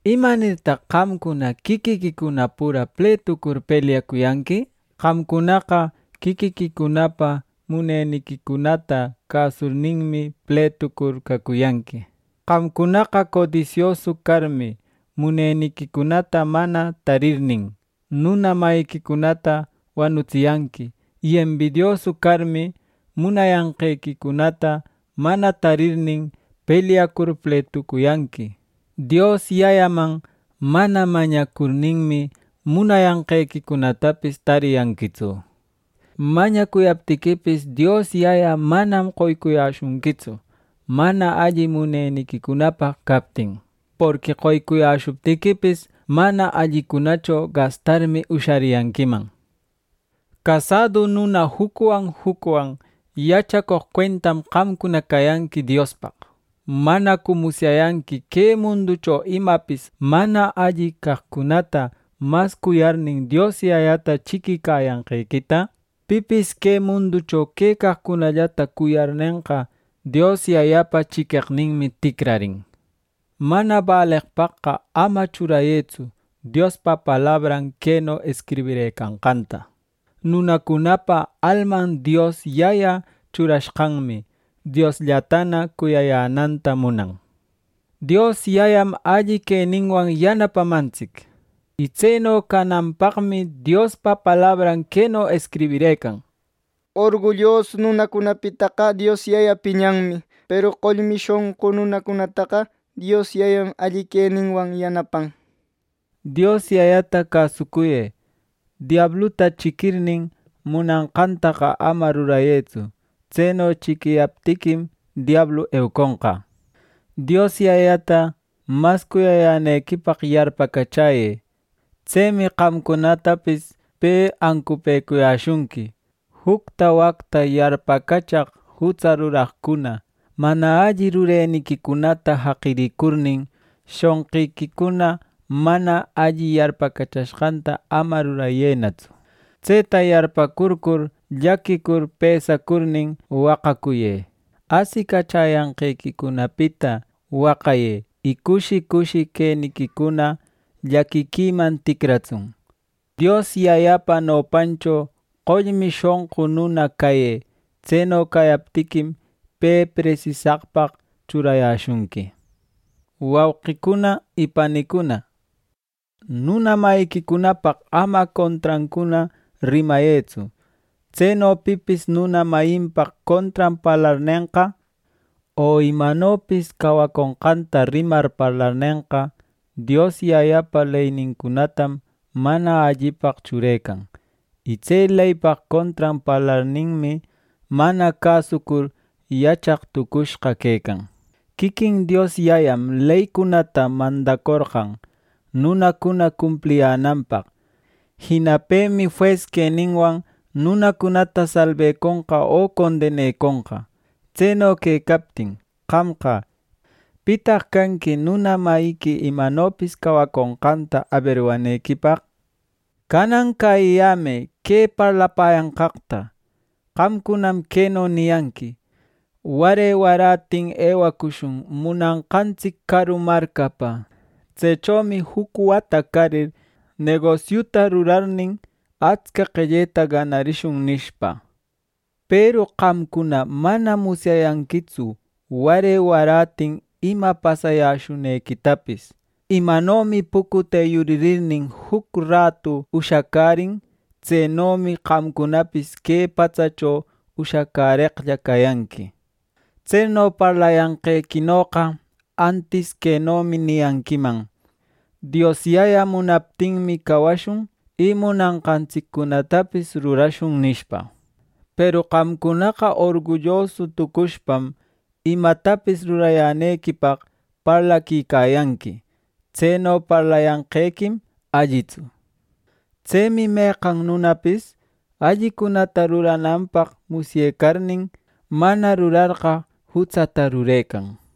¿Imanirtaq qamcuna quiquiquicuna pura pletucur pelyacuyanqui? Qamcunaqa quiquiquicunapa muneniquicunata cäsurninmi, pletucur cacuyanqui. Qamcunaqa codisiosu carmi, muneniquicunata mana tarirnin, nuna mayiquicunata wanutsiyanqui. Y embidiosu carmi, munayanqequicunata mana tarirnin, pelyacur pletucuyanqui. Dios Yayaman mana mañacurninmi, munayanqequicunatapis tariyanquitsu. Mañacuyaptiquipis, Dios Yaya manam qoycuyäshunquitsu, mana alli muneniquicunapaq captin. Porqui qoycuyäshuptiquipis, mana allicunacho gastarmi ushariyanquiman. Casadu nuna jucwan jucwan yachacoq cuentam qamcuna cayanqui Diospaq. ¿Manacu musyayanqui que munducho imapis mana alli caqcunata mas cuyarnin, Dios Yayata chiquicayanqequita? Pipis que munducho quecaqcunallata cuyarnenqa, Dios Yayapa chiqueqninmi ticrarin. Mana baleqpaqqa ama churayëtsu Diospa palabran queno escribirëcanqanta: “Nunacunapa alman Dios Yaya churashqanmi, Diosllatana cuyayänanta munan.” Dios Yayam alli queninwan yanapamantsic. Y tseno cananpaqmi Diospa palabran queno escribirëcan: “Orgullosu nunacunapitaqa Dios Yaya piñanmi; peru qollmi shonqu nunacunataqa Dios Yayam alli queninwan yanapan.” Dios Yayata cäsucuyë. Diabluta chiquirnin, munanqantaqa ama rurayëtsu. Tseno chiquiyaptiquim diablu euconqa. Dios Yayata mas cuyayänequipaq yarpacachäyë. Tsemi qamcunatapis pe ancupëcuyäshunqui. Jucta wacta yarpacachaq jutsa ruraqcuna, mana alli rureniquicunata jaqirïcurnin, shonqiquicuna mana alli yarpacachashqanta ama rurayënatsu. Tseta yarpäcurcur llaquicur pesacurnin waqacuyë. Asicachäyanqequicunapita waqayë, y cushi cushi queniquicuna llaquiquiman ticratsun. Dios Yayapa nopancho qollmi shonqu nuna cayë. Tseno cayaptiquim, pe presisaqpaq churayäshunqui. Wauqicuna y panicuna, nuna mayiquicunapaq ama contrancuna rimayëtsu. Tseno pipis nuna mayinpaq contran parlarnenqa, o imanopis cawaconqanta rimar parlarnenqa, Dios Yayapa leynincunatam mana allipaq churecan. Y tse leypaq contran parlarninmi, mana cäsucur yachaq tucushqa quecan. Quiquin Dios Yayam leycunata mandacorqan nunacuna cumpliyänanpaq. Jina pemi jues queninwan nunacunata salbeconqa, o condeneconqa. Tseno quecaptin, qamqa, ¿pitaq canqui nuna mayiqui imanopis cawaconqanta aberwanequipaq! Canan cäyiyämë que parlapäyanqaqta. Qamcunam queno niyanqui: “Ware warätin ewacushun munanqantsic caru marcapa. Tsechomi juc wata carir, negosiuta rurarnin, atsca qelleta ganarishun” nishpa. Peru qamcuna manam musyayanquitsu ware warätin ima pasayäshunequitapis. Imanomi pucute yuririrnin juc ratu ushacärin; tsenomi qamcunapis que patsacho ushacäreqlla cayanqui. Tseno parlayanqequinoqa antis quenomi niyanquiman: “Dios Yaya munaptinmi, cawashun; y munanqantsiccunatapis rurashun” nishpa. Peru qamcunaqa orgullosu tucushpam, imatapis rurayänequipaq parlaquicayanqui; tseno parlayanqequim allitsu. Tsemi meqan nunapis allicunata rurananpaq musyecarnin, mana rurarqa, jutsata rurecan.